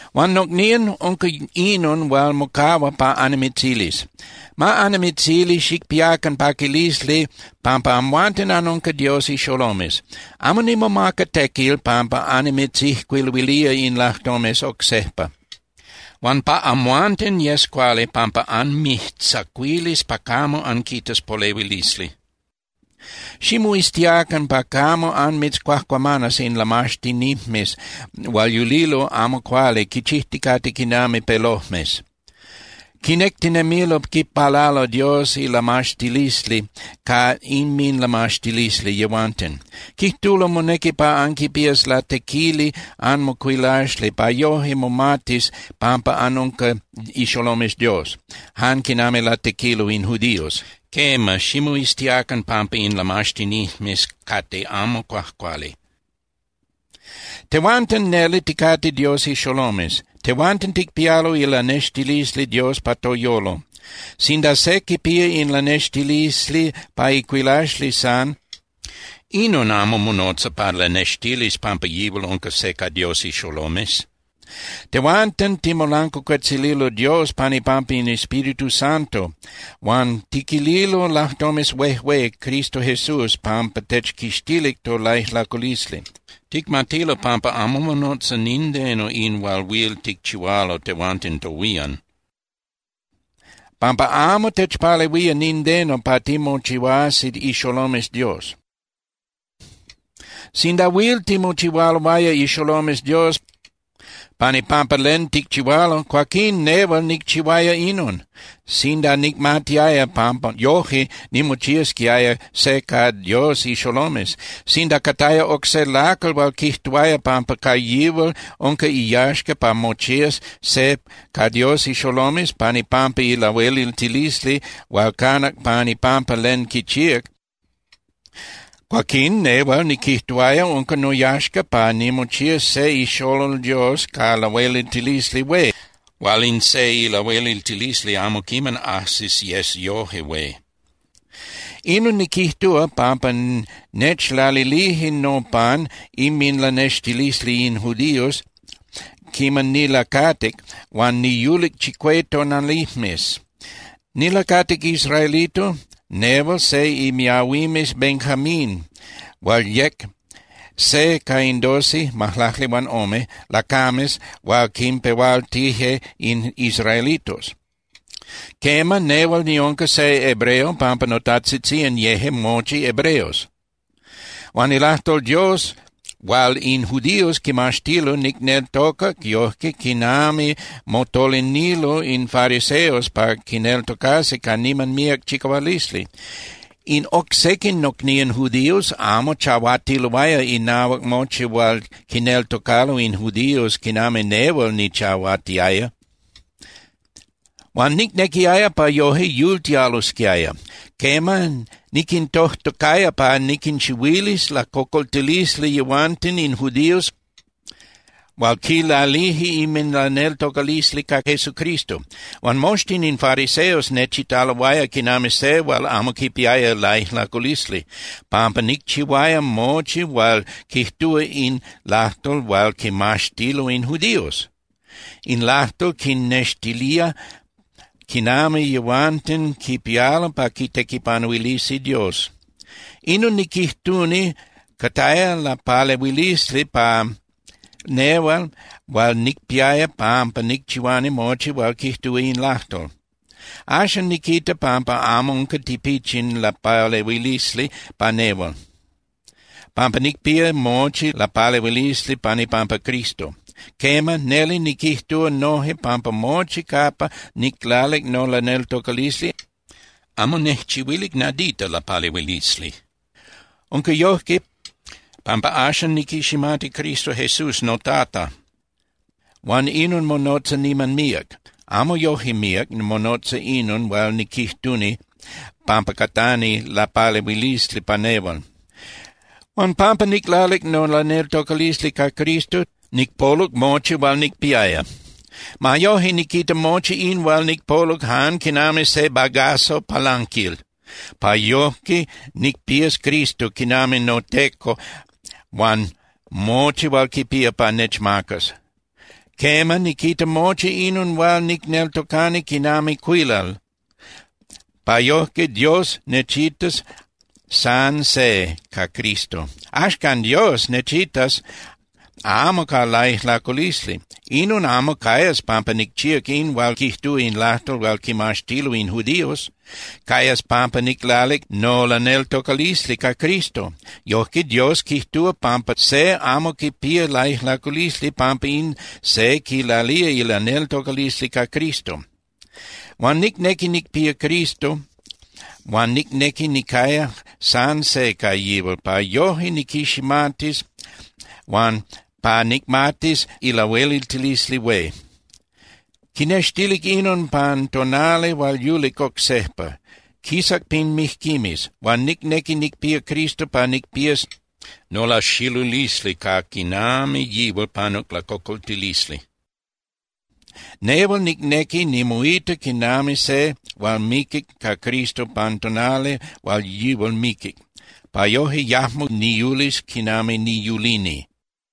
Huan nocnían, unca inon hual mocahua pa annimitzilis: Ma annimitzili xicpiacan paquilisli pampa amhuanten anunca Dios ixolomes. Amo nimomaca tequil pampa annimitzijcuiluilía in lajtomes oc sejpa. Huan pa amhuanten yes cuali pampa anmijtzacuilis pa camo anquitas polehuilisli. Ximoiztiacan pa camo anmitzcuajcuamanas in lamaxtinijmes hual yulilo amo cuali quichijticate quinami pelojmes. Quinectinemilo quipalalo Dios ilamaxtilisli ca inminlamaxtilisli yehuanten. Quijtulo monequi pa anquipías latequili anmocuilaxli pa yoje momatis pampa anunca ixolomes Dios, jan quinami latequilo in judíos. Quema, ximoiztiacan pampa in lamaxtinijmes cate amo cuajcuali. Tehuanten neli ticate Dios ixolomes. Tehuanten ticpialo ilanextilisli Dios pa toyolo. Sinda se quipía in lanextilisli pa icuilaxli san, inon amo monotza pa lanextilis pampa yihual unca se ca Dios ixolomes. Tehuanten ticmolancuacuetzililo Dios pan ipampa in Espíritu Santo huan tiquililo lajtomes huejué Cristo Jesús pampa techquixtilic tolaijlaculisli. Ticmatilo pampa amo monotza nindeno in hual huil ticchihualo tehuanten tohuían, pampa amo techpalehuía nindeno pa timochihuasi ixolomes Dios. Sinda huil timochihualoaya ixolomes Dios pan ipampa len ticchihualo, cuaquín nehual nicchihuaya inon, sinda nicmatiaya pampa yoje nimochiasquiaya se ca Dios ixolomes. Sinda cataya oc se lacal hual quijtuaya pampa ca yihual unca iyaxca pa mochías se ca Dios ixolomes pan ipampa ilahueliltilisli hual canac pan ipampa len quichíac, cuaquín nehual niquijtuaya unca noyaxca pa nimochías se ixolol Dios ca lahueliltilisli hué hual in se ilahueliltilisli amo quiman ajsis yes yoje hué. Inon niquijtúa, pampa nechlalilije nopan inminlanextilisli in judíos quiman nilacatic huan niyulic chicué tonalijmes. Nilacatic israelito, nehual se imiahuimes Benjamin hual yec se ca in doce (majlacli huan ome) lacames hual quinpehualtije in israelitos. Quema, nehual niunca se hebreo pampa notajtzitzían yeje mochi hebreos. Huan ilajtol Dios hual in judíos quimaxtilo nicneltocac yojque quinami motolinilo in fariseos pa quineltocasi ca niman míac chicahualisli. In oc sequin nocnían judíos amo chahuatiloaya inahuac mochi hual quineltocalo in judíos quinami nehual nichahuatiaya. Huan nicnequiaya pa yoje yultialosquiaya. Quema, niquintojtocaya pa niquinchihuilis lacocoltilisli yehuanten in judíos hual quilalije inminlaneltocalisli ca Jesucristo. Huan moxtin in fariseos nechitaloaya quinami se hual amo quipiaya laijlaculisli, pampa nicchihuaya mochi hual quijtúa in lajtol hual quimaxtilo in judíos. In lajtol quinnextilía quinami yehuanten quipialo pa quitequipanuilisi Dios. Inon niquijtuni cataya lapalehuilisli pa nehual hual nicpiaya pampa nicchihuani mochi hual quijtúa in lajtol. Axan niquita pampa amo unca tipichin lapalehuilisli pa nehual, pampa nicpía mochi lapalehuilisli pan ipampa Cristo. Quema, neli niquijtúa noje pampa mochi capa niclalic nolaneltocalisli amo nejchihuilic nadita lapalehuilisli. Unca yojque, pampa axan niquiximati Cristo Jesús noTata huan inon monotza niman míac, amo yoje míac monotza inon hual niquijtuni pampa catani lapalehuilisli pa nehual. Huan pampa niclalic nolaneltocalisli ca Cristo, nicpoluc mochi hual nicpiaya. Ma yoje niquita mochi in hual nicpoluc jan quinami se bagazo palanquil, pa yojque nicpías Cristo quinami noTeco huan mochi hual quipía pa nechmacas. Quema, niquita mochi inon hual nicneltocani quinami cuilal pa yojque Dios nechitas san se ca Cristo. Axcan Dios nechitas amo ca laijlaculisli. Inon amo cayas pampa nicchíac in hual quijtúa in lajtol hual quimaxtilo in judíos. Cayas pampa niclalic nolaneltocalisli ca Cristo. Yojque Dios quijtúa pampa se amo quipía laijlaculisli pampa in se quilalía ilaneltocalisli ca Cristo. Huan nicnequi nicpía Cristo huan nicnequi nicaya san se ca yihual pa yoje niquiximatis huan pa nicmatis ilahueliltilisli hué. Quinextilic inon pan tonali hual yulic oc sejpa. Quisac pin mijquimes. Huan nicnequi nicpía Cristo pa nicpías nolaxilulisli ca quinami yihual panuc lacocoltilisli. Nehual nicnequi nimoita quinami se hual miquic ca Cristo pan tonali hual yihual miquic, pa yoje yajmo niyulis quinami niyulini.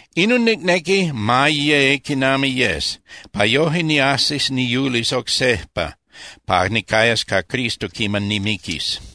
Inon nicnequi ma ye quinami yes, pa yoje niajsis niyulis oc sejpa pa nicayas ca Cristo quiman nimiquis.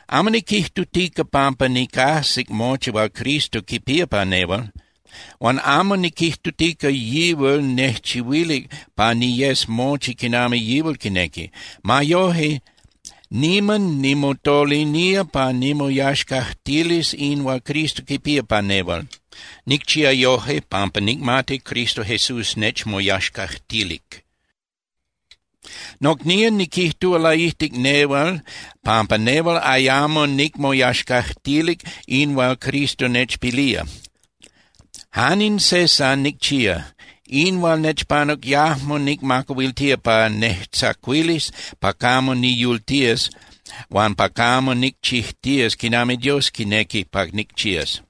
Amo niquijtutica pampa nicajsic mochi hual Cristo quipía pa nehual. Huan amo niquijtutica yihual nejchihuilic pa niyes mochi quinami yihual quinequi. Ma yoje, niman nimotolinía pa nimoyaxcajtilis in hual Cristo quipía pa nehual. Nicchía yoje pampa nicmati Cristo Jesús nechmoyaxcajtilic. Nocnían, niquijtúa laijtic nehual pampa nehual ayamo nicmoyaxcajtilic in hual Cristo nechpilía. Jan in se san nicchía. In hual nechpanuc yajmo nicmacahuiltía pa nejtzacuilis pa camo niyultías huan pa camo nicchijtías quinami Dios quinequi pa nicchías.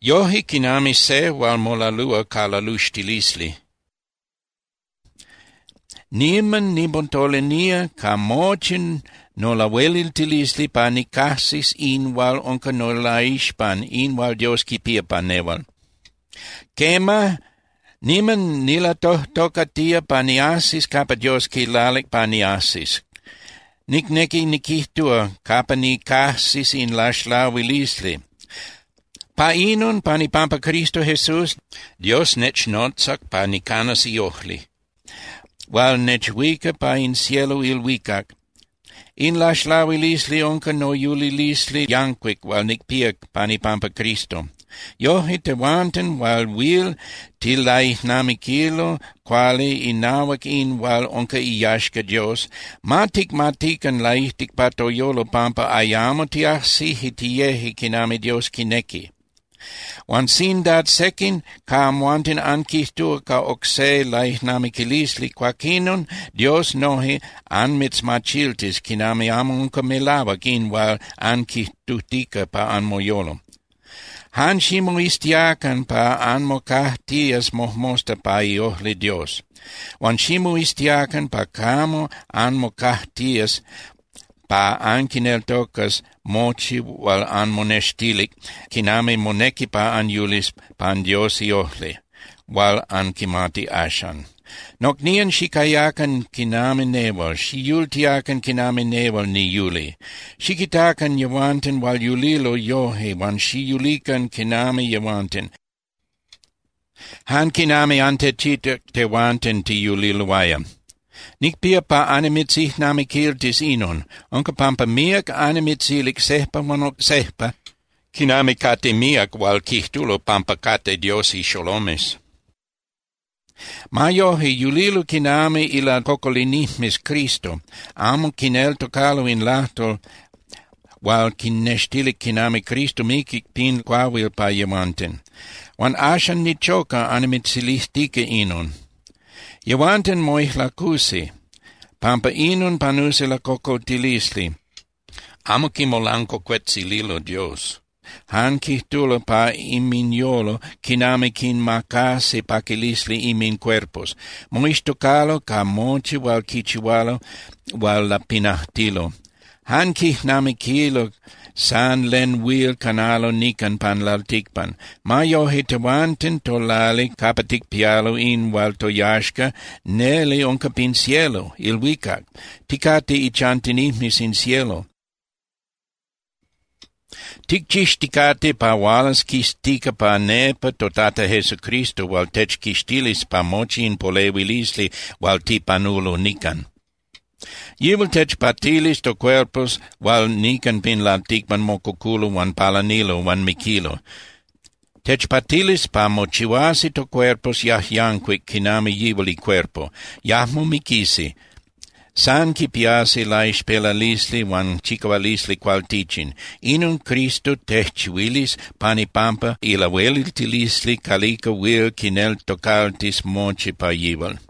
Yoje, quinami se hual molalúa ca laluxtilisli, niman nimotolinía ca mochi nolahueliltilisli pa nicajsis in hual unca nolaixpan, in hual Dios quipía pa nehual. Quema, niman nilatojtocatía pa niajsis capa Dios quilalic pa niajsis, nicnequi niquijtúa, capa nicajsis in laxlahuilisli. Pa inon pan ipampa Cristo Jesús, Dios nechnotzac pa nicanas iojli hual nechuica pa in cielo (ilhuicac). In laxlahuilisli unca noyulilisli yancuic hual nicpía pan ipampa Cristo. Yoje, tehuanten hual huil tilaijnamiquilo cuali inahuac in hual unca iyaxca Dios, ma ticmatican laijtic pa toyolo pampa ayamo tiajsije tiyeje quinami Dios quinequi. Huan sinda sequin ca amhuanten anquijtúa ca oc se laijnamiquilisli, cuaquinon Dios noje anmitzmachiltis quinami amo unca melahuac in hual anquijtutica pa anmoyolo. Jan ximoiztiacan pa anmocajtías mojmosta pa iojli Dios. Huan ximoiztiacan pa camo anmocajtías pa anquineltocas mochi hual anmonextilic quinami monequi pa anyulis pan Dios iojli, hual anquimati axan. Nocnían, xicayacan quinami nehual, xiyultiacan quinami nehual niyuli. Xiquitacan yehuanten hual yulilo yoje huan xiyulican quinami yehuanten, jan quinami antechitac tehuanten tiyuliloaya. Nicpía pa annimitzijnamiquiltis inon. Unca pampa míac annimitzilic sejpa huan oc sejpa quinami cate míac hual quijtulo pampa cate Dios ixolomes. Ma yoje, yulilo quinami ilacocolinijmes Cristo. Amo quineltocalo in lajtol hual quinnextilic quinami Cristo miquic pin cuahuil pa yehuanten. Huan axan nichoca annimitzilijtica inon. Yehuanten moijlacusi, pampa inon panusi lacocoltilisli. Amo quimolancuacuetzililo Dios, jan quijtulo pa inminyolo quinami quinmacasi paquilisli inmincuerpos. Moixtocalo ca mochi hual quichihualo hual lapinajtilo. Jan quijnamiquilo san len huil canalo nican pan lalticpan. Ma yoje, tehuanten tolali capa ticpialo in hual toyaxca neli unca pin cielo (ilhuicac), ticate ichantinijmes in cielo. Ticchixticate pa hualas quistica pa nepa toTata Jesucristo hual techquixtilis pa mochi in polehuilisli hual tipanulo nican. Yihual techpatilis tocuerpos hual nican pin lalticpan mococulo huan palanilo huan miquilo. Techpatilis pa mochihuasi tocuerpos yajyancuic quinami yihual icuerpo. Yajmo miquisi, san quipiasi laixpelalisli huan chicahualisli cualtichin. Inon Cristo tejchihuilis pan ipampa ilahueliltilisli calica huil quinneltocaltis mochi pa yihual.